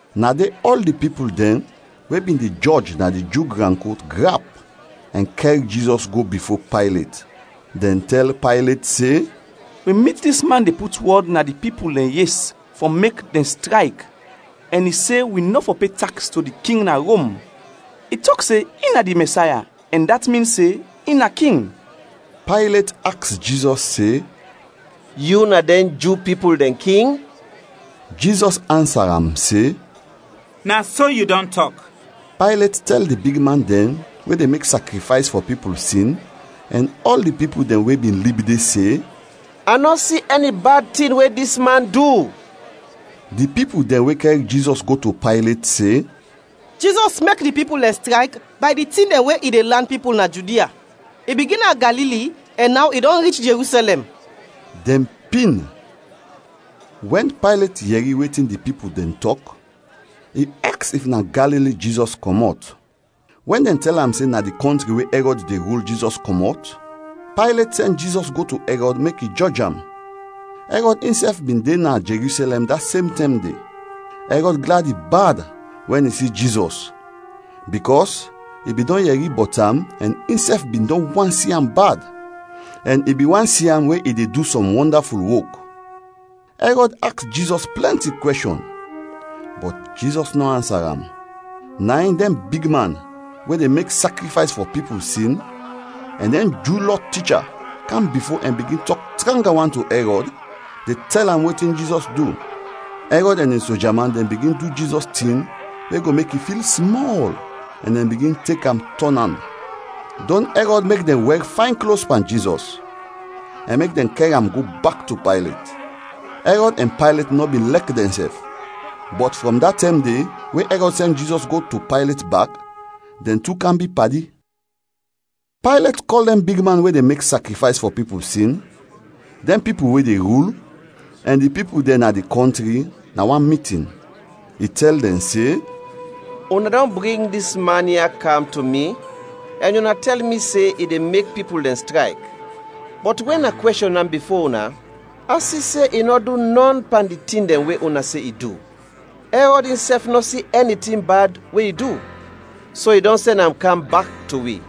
Na de ɔl di pipul dɛn we bin de jɔj na di Ju gran kot grap ɛn kɛr Jizɔs go bifo Paylet. Dɛn tɛl Paylet se, “Wi mit dis man de put wɔd na di pipul dɛn yes fɔ mek dɛn strayk ɛn i se wi nɔ fɔ pe taks to di king na Rom. I tɔk se in na di Mɛsaya ɛn dat min se in na king.” Paylet aks Jizɔs se, “Yu na dɛn Ju pipul dɛn king?” Jizɔs ansa am se, “Na so yu dɔn tɔk.” Paylet tɛl di bigman dɛn we de mek sakrifays fɔ pipul sin ɛn ɔl di pipul dɛn we bin lib de se, “A nɔ si ɛni bad tin we dis man du.” Di pipul dɛn we kɛr Jizɔs go to Paylet se, “Jizɔs mek di pipul dɛn strayk bay di tin dɛn we i de lan pipul na Judia. I bigin na Galili ɛn naw i dɔn rich Jerusɛlɛm.” Dɛn pin. Wɛn Paylet yɛri wetin di pipul dɛn tɔk, i aks if na Galili Jizɔs kɔmɔt. Wɛn dɛn tɛl am se na di kɔntri we Ɛrɔd de rul Jizɔs kɔmɔt, Paylet sɛn Jizɔs go to Ɛrɔd mek i jɔj am; Ɛrɔd insɛf bin de na Jerusɛlɛm da sem tɛm de. Ɛrɔd gladi bad wɛn i si Jizɔs bikɔs i bin dɔn yɛri bɔt am ɛn insɛf bin dɔn want si am bad, ɛn i bin want si am we i de du sɔm wɔndaful wok. Ɛrɔd aks Jizɔs plɛnti kwɛshɔn, bɔt Jizɔs nɔ ansa am. Na in dɛn bigman we de mek sakrifays fɔ pipul sin ɛn dɛn Ju Lɔ ticha kam bifo ɛn bigin tɔk tranga wan to Ɛrɔd de tɛl am wetin Jizɔs du. Ɛrɔd ɛn in soja man dɛn bigin du Jizɔs tin we go mek i fil smɔl ɛn dɛn bigin tek am tɔn an. Dɔn Ɛrɔd mek dɛn wɛr fayn klos pan Jizɔs, ɛn mek dɛn kɛr am go bak to Paylet. Ɛrɔd ɛn Paylet nɔ bin lɛk dɛnsɛf, bɔt frɔm da tɛm de we Ɛrɔd sɛn Jizɔs go to Paylet bak, dɛn tu kam bi padi. Paylet kɔl dɛn bigman we de mek sakrifays fɔ pipul sin, dɛn pipul we de rul, ɛn di pipul dɛn na di kɔntri, na wan mitin. I tɛl dɛn se, “Una dɔn bring dis man ya kam to mi ɛn una tɛl mi se i de mek pipul dɛn strayk, bɔt wɛn a kwɛshɔn am bifo una, a si se i nɔ du nɔn pan di tin dɛn we una se i du. Ɛrɔd insɛf nɔ si ɛni tin bad we i du, so i dɔn sɛn am kam bak to wi.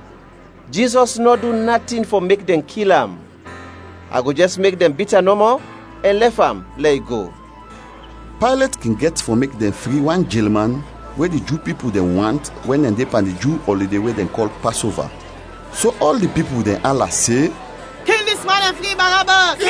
Jizɔs nɔ du natin fɔ mek dɛn kil am. A go jɛs mek dɛn bit am nɔmɔ, ɛn lɛf am lɛ i go.” [ Paylet kin gɛt fɔ mek dɛn fri wan jelman we di Ju pipul dɛn want wɛn dɛn de pan di Ju ɔlide we dɛn kɔl Pasova.] So ɔl di pipul dɛn ala se, “Kil dis man ɛn fri Barabas.”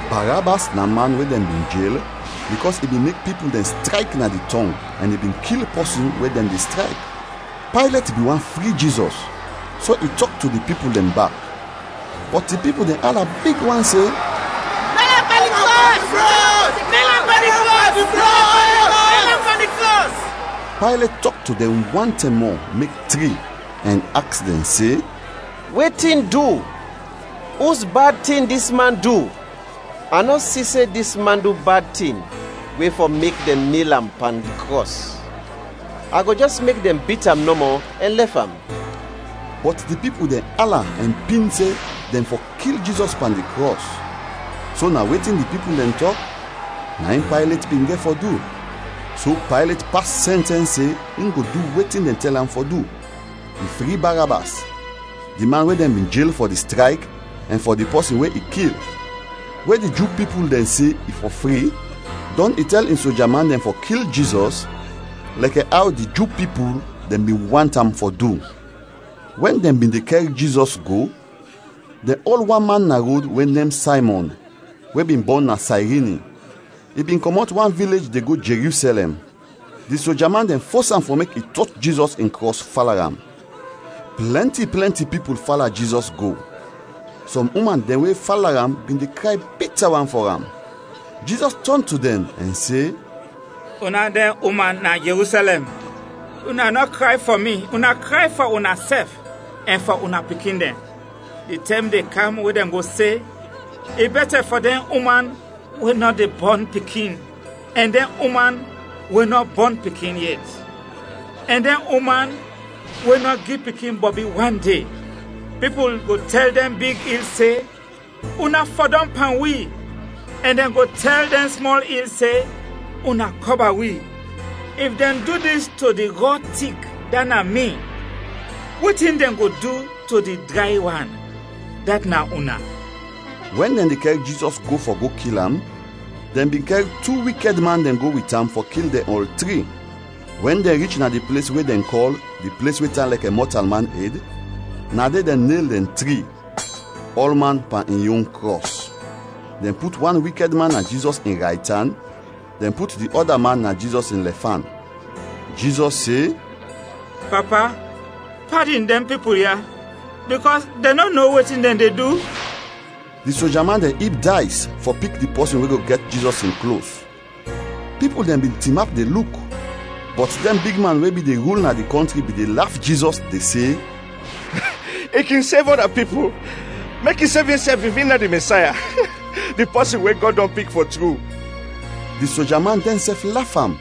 Barabas na man we dɛn bin jel bikɔs i bin mek pipul dɛn strayk na di tɔng ɛn i bin kil pɔsin wɛn dɛn de strayk. Paylet bin want fri Jizɔs so i tɔk to di pipul dɛn bak, bɔt di pipul dɛn ala big wan se, “Nel am pan di krɔs! Nel am pan di krɔs!” Paylet tɔk to dɛn wan tɛm mɔ mek tri ɛn aks dɛn se, “Wetin du, us bad tin dis man du? A nɔ si se dis man du bad tin we fɔ mek dɛn nel am pan di krɔs; a go jɛs mek dɛn bit am nɔmɔ ɛn lɛf am.” Bɔt di pipul dɛn ala ɛn pin se dɛn fɔ kil Jizɔs pan di krɔs. So na wetin di pipul dɛn tɔk, na in Paylet bin gɛt fɔ du. So Paylet pas sɛntɛns se in go du wetin dɛn tɛl am fɔ du. I fri Barabas, di man we dɛn bin jel fɔ di strayk ɛn fɔ di pɔsin we i kil, we di Ju pipul dɛn se i fɔ fri, dɔn i tɛl in soja man dɛn fɔ kil Jizɔs lɛkɛ aw di Ju pipul dɛn bin want am fɔ du. Wɛn dɛn bin de kɛr Jizɔs go, dɛn ol wan man na rod we nem Saymɔn we bin bɔn na Sayrini; i bin kɔmɔt wan vilej de go Jerusɛlɛm. Di soja man dɛn fos am fɔ mek i tot Jizɔs in krɔs fala am. Plɛnti plɛnti pipul fala Jizɔs go, sɔm uman dɛn we fala am bin de kray bita wan fɔ am. Jizɔs tɔn to dɛn ɛn se, “Una dɛn uman na Jerusɛlɛm, una nɔ kray fɔ mi, una kray fɔ unasɛf ɛn fɔ una pikin dɛn. Di tɛm de kam we dɛn go se, ‘I bɛtɛ fɔ dɛn uman we nɔ de bɔn pikin ɛn dɛn uman we nɔ bɔn pikin yet ɛn dɛn uman we nɔ gi pikin bɔbi wan de!’ Pipul go tɛl dɛn big il se, ‘Una fɔdɔm pan wi!’ ɛn dɛn go tɛl dɛn smɔl il se, ‘Una kɔba wi!’ If dɛn du dis to di rɔ tik, dat na mi; wetin dɛn go du to di dray wan, dat na una?” Wɛn dɛn de kɛr Jizɔs go fɔ go kil am, dɛn bin kɛr tu wikɛd man dɛn go wit am fɔ kil dɛn ɔl tri. Wɛn dɛn rich na di ples we dɛn kɔl “Di ples we tan lɛkɛ mɔtalman ed,” na de dɛn nel dɛn tri, ɔlman pan in yon krɔs. Dɛn put wan wikɛd man na Jizɔs in raytan, dɛn put di ɔda man na Jizɔs in lɛfan. Jizɔs se, “Papa, padin dɛn pipul ya bikɔs dɛn nɔ no wetin dɛn de du.” Di soja man dɛn ib days fɔ pik di pɔsin we go gɛt Jizɔs in klos. Pipul dɛn bin tinap de luk, bɔt dɛn bigman we bin de rul na di kɔntri bin de laf Jizɔs, de se, “I kin sev ɔda pipul, mek i sev insɛf if in na di Mɛsaya, di pɔsin we Gɔd dɔn pik, fɔ tru!” Di sojaman dɛnsɛf laf am,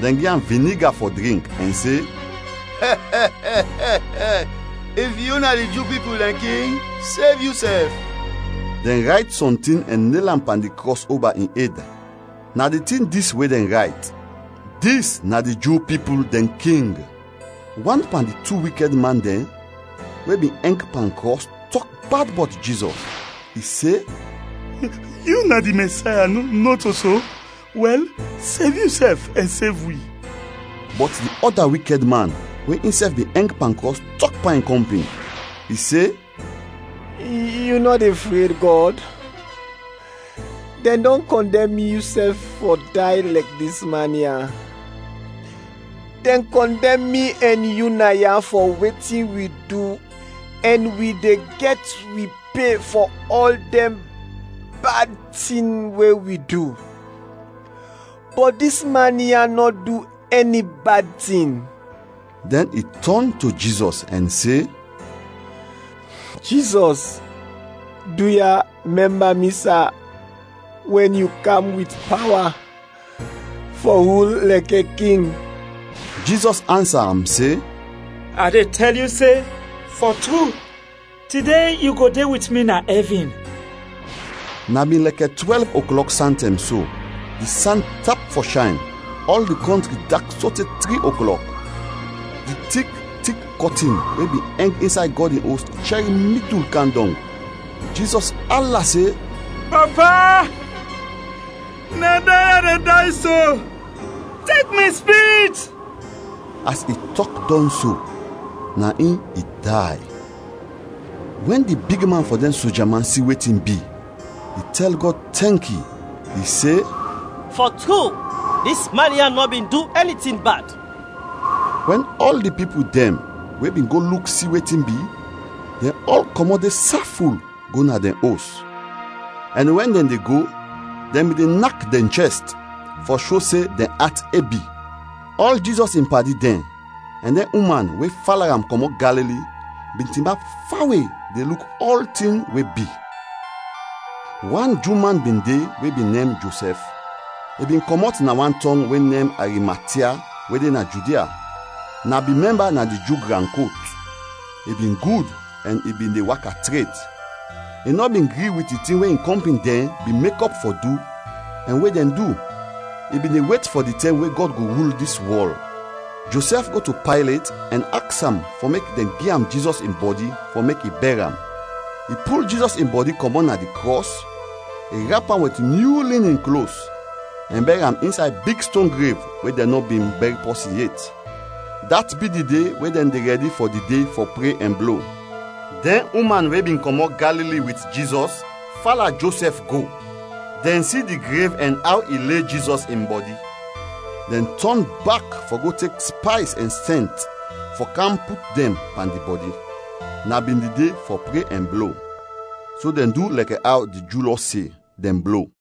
dɛn gi am viniga fɔ drink ɛn se, “If yu na di Ju pipul dɛn king, sev yusɛf.” Dɛn rayt sɔntin ɛn nel am pan di krɔs oba in ed. Na di tin dis we dɛn rayt: “DIS NA DI JU PIPUL DƐN KING.” Wan pan di tu wikɛd man dɛn we bin ɛng pan krɔs tɔk bad bɔt Jizɔs, i se, “Yu na di Mɛsaya, nɔto so? Wɛl, sev yusɛf ɛn sev wi!” Bɔt di ɔda wikɛd man we insɛf bin ɛng pan krɔs, tɔk pan in kɔmpin. I se, “Yu nɔ de fred Gɔd? Dɛn dɔn kɔndɛm yusɛf fɔ day lɛkɛ dis man ya. Dɛn kɔndɛm mi ɛn yu naya fɔ wetin wi du ɛn wi de gɛt wi pe fɔ ɔl dɛn bad tin we wi du, bɔt dis man ya nɔ du ɛni bad tin.” Dɛn i tɔn to Jizɔs ɛn se, “Jizɔs, duya, mɛmba mi, sa, wɛn yu kam wit pawa fɔ rul lɛkɛ King!” Jizɔs ansa am se, “A de tɛl yu se, fɔ tru, tide yu go de wit mi na ɛvin.” Na bin lɛkɛ twɛlv oklɔk santɛm so, di san tap fɔ shayn, ɔl di kɔntri dak sote tri oklɔk. Di tik, tik kɔtin we bin ɛng insay Gɔd in Os chɛr midul kam dɔng. Jizɔs ala se, “Papa, na day a de day so, tek mi spirit!” As i tɔk dɔn so, na in i day. Wɛn di bigman fɔ dɛn soja man si wetin bi, i tɛl Gɔd tɛnki, i se, “Fɔ tru, dis man ya nɔ bin du ɛni tin bad.” Wɛn ɔl di pipul dɛn we bin go luk si wetin bi, dɛn ɔl kɔmɔt de saful go na dɛn os, ɛn wɛn dɛn de go dɛn bin de nak dɛn chɛst fɔ sho se dɛn at ebi. Ɔl Jizɔs in padi dɛn ɛn dɛn uman we fala am kɔmɔt Galili, bin tinap fawe de luk ɔltin we bi. Wan Ju man bin de we bin nem Josɛf. I bin kɔmɔt na wan tɔng we nem Arimatia we de na Judia; na bin mɛmba na di Ju gran kot. I bin gud ɛn i bin de waka tret, i nɔ bin gri wit di tin we in kɔmpin dɛn bin mekɔp fɔ du ɛn we dɛn du. I bin de wet fɔ di tɛm we Gɔd go rul dis wɔl. Josɛf go to Paylet ɛn aks am fɔ mek dɛn gi am Jizɔs in bɔdi fɔ mek i bɛr am. I pul Jizɔs in bɔdi kɔmɔt na di krɔs, i rap am wit nyu linin klos ɛn bɛr am insay big ston grev we dɛn nɔ bin bɛr pɔsin yet. Dat bi di de we dɛn de rɛdi fɔ di de fɔ pre ɛn blo. Dɛn uman we bin kɔmɔt Galili wit Jizɔs, fala Josɛf go, dɛn si di grev ɛn aw i le Jizɔs in bɔdi, dɛn tɔn bak fɔ go tek spays ɛn sɛnt fɔ kam put dɛn pan di bɔdi. Na bin di de fɔ pre ɛn blo, so dɛn du lɛkɛ aw di Ju Lɔ se, dɛn blo.